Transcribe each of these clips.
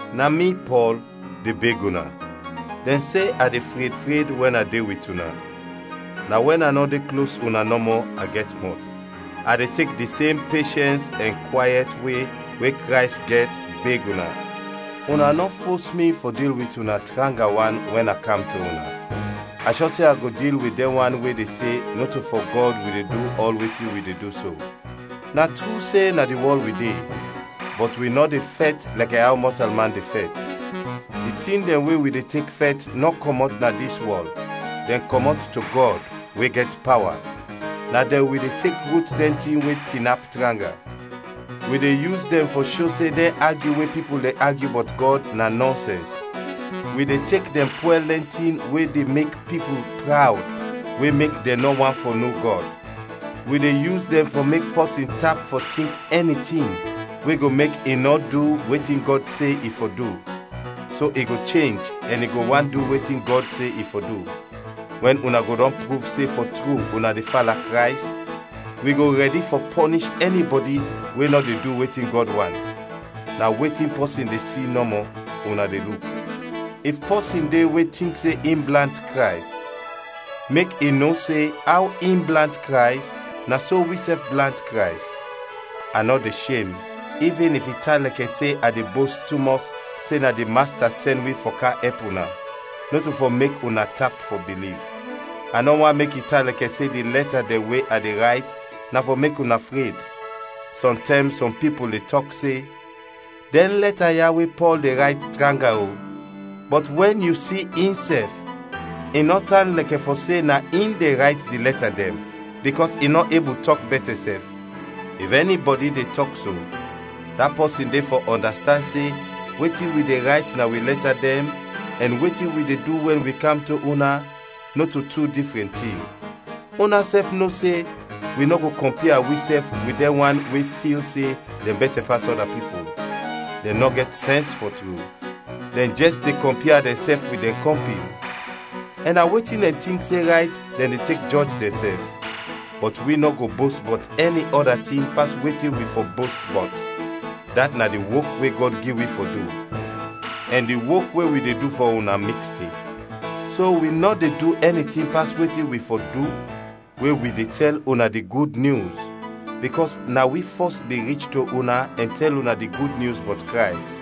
Na mi, Pɔl, de beg una dɛn se a de fred fred wɛn a de wit una, na wɛn a nɔ de klos una nɔmɔ, a gɛt mɔt. A de tek di sem peshɛns ɛn kwayɛt we we Krays gɛt beg una: una nɔ fos mi fɔ dil wit una tranga wan wɛn a kam to una; a shɔ se a go dil wit dɛn wan we de se nɔto fɔ Gɔd wi de du ɔl wetin wi de du so. Na tru se na di wɔl wi de, bɔt wi nɔ de fɛt lɛkɛ aw mɔtalman de fɛt. Di tin dɛn we wi de tek fɛt nɔ kɔmɔt na dis wɔl, dɛn kɔmɔt to Gɔd, we gɛt pawa; na dɛn wi de tek rut dɛn tin we tinap tranga. Wi de yus dɛn fɔ sho se dɛn agyu we pipul de agyu bɔt Gɔd na nɔnsɛns; wi de tek dɛn pwɛl dɛn tin we de mek pipul prawd we mek dɛn nɔ want fɔ no Gɔd; wi de yus dɛn fɔ mek pɔsin tap fɔ tink ɛni tin we go mek i nɔ du wetin Gɔd se i fɔ du, so i go chenj ɛn i go want du wetin Gɔd se i fɔ du. Wɛn una go dɔn pruv se fɔ tru una de fala Krays, wi go rɛdi fɔ pɔnish ɛnibɔdi we nɔ de du wetin Gɔd want. Na wetin pɔsin de si nɔmɔ, una de luk. If pɔsin de we tink se in blant Krays, mek i no se aw in blant Krays, na so wisɛf blant Krays. A nɔ de shem ivin if i tan lɛkɛ se a de bost tumɔs se na di Masta sɛn wi fɔ kam ɛp una, nɔto fɔ mek una tap fɔ biliv. A nɔ want mek i tan lɛkɛ se di lɛta dɛn we a de rayt na fɔ mek una fred. Sɔntɛm sɔm pipul de tɔk se, “Dɛn lɛta ya we Pɔl de rayt tranga o, bɔt wɛn yu si insɛf, i nɔ tan lɛkɛ fɔ se na in de rayt di lɛta dɛn, bikɔs i nɔ ebul tɔk bɛtɛ sɛf.” If ɛnibɔdi de tɔk so, da pɔsin de fɔ ɔndastand se wetin wi de rayt na wi lɛta dɛn ɛn wetin wi de du wɛn wi kam to una, nɔto tu difrɛn tin. Unasɛf no se wi nɔ go kɔmpia wisɛf wit dɛn wan we fil se dɛn bɛtɛ pas ɔda pipul. Dɛn nɔ gɛt sɛns, fɔ tru! Dɛn jɛs de kɔmpia dɛnsɛf wit dɛn kɔmpin, ɛn na wetin dɛn tink se rayt dɛn de tek jɔj dɛnsɛf! Bɔt wi nɔ go bost bɔt ɛni ɔda tin pas wetin wi fɔ bost bɔt; dat na di wok we Gɔd gi wi fɔ du, ɛn di wok we wi de du fɔ una miks de. So wi nɔ de du ɛni tin pas wetin wi fɔ du we wi de tɛl una di Gud Nyus, bikɔs na wi fɔs bin rich to una ɛn tɛl una di Gud Nyus bɔt Krays.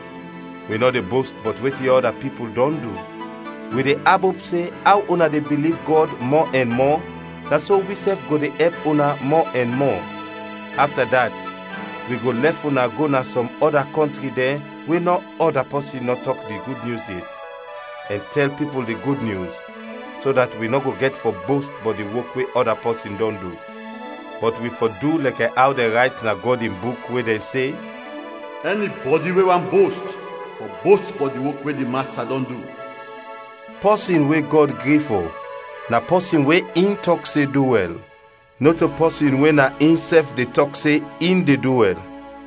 Wi nɔ de bost bɔt wetin ɔda pipul dɔn du; wi de abop se aw una de biliv Gɔd mɔ ɛn mɔ, na so wisɛf go de ɛp una mɔ ɛn mɔ. Afta dat, wi go lɛf una go na sɔm ɔda kɔntri dɛn we nɔ ɔda pɔsin nɔ tɔk di Gud Nyus yet, ɛn tɛl pipul di Gud Nyus, so dat wi nɔ go gɛt fɔ bost bɔt di wok we ɔda pɔsin dɔn du. Bɔt wi fɔ du lɛkɛ aw dɛn rayt na Gɔd in Buk, we dɛn se, “Ɛnibɔdi we want bost, fɔ bost bɔt di wok we di Masta dɔn du.” Pɔsin we Gɔd gri fɔ, na pɔsin we in tɔk se du wɛl, nɔto pɔsin we na insɛf de tɔk se in de du wɛl.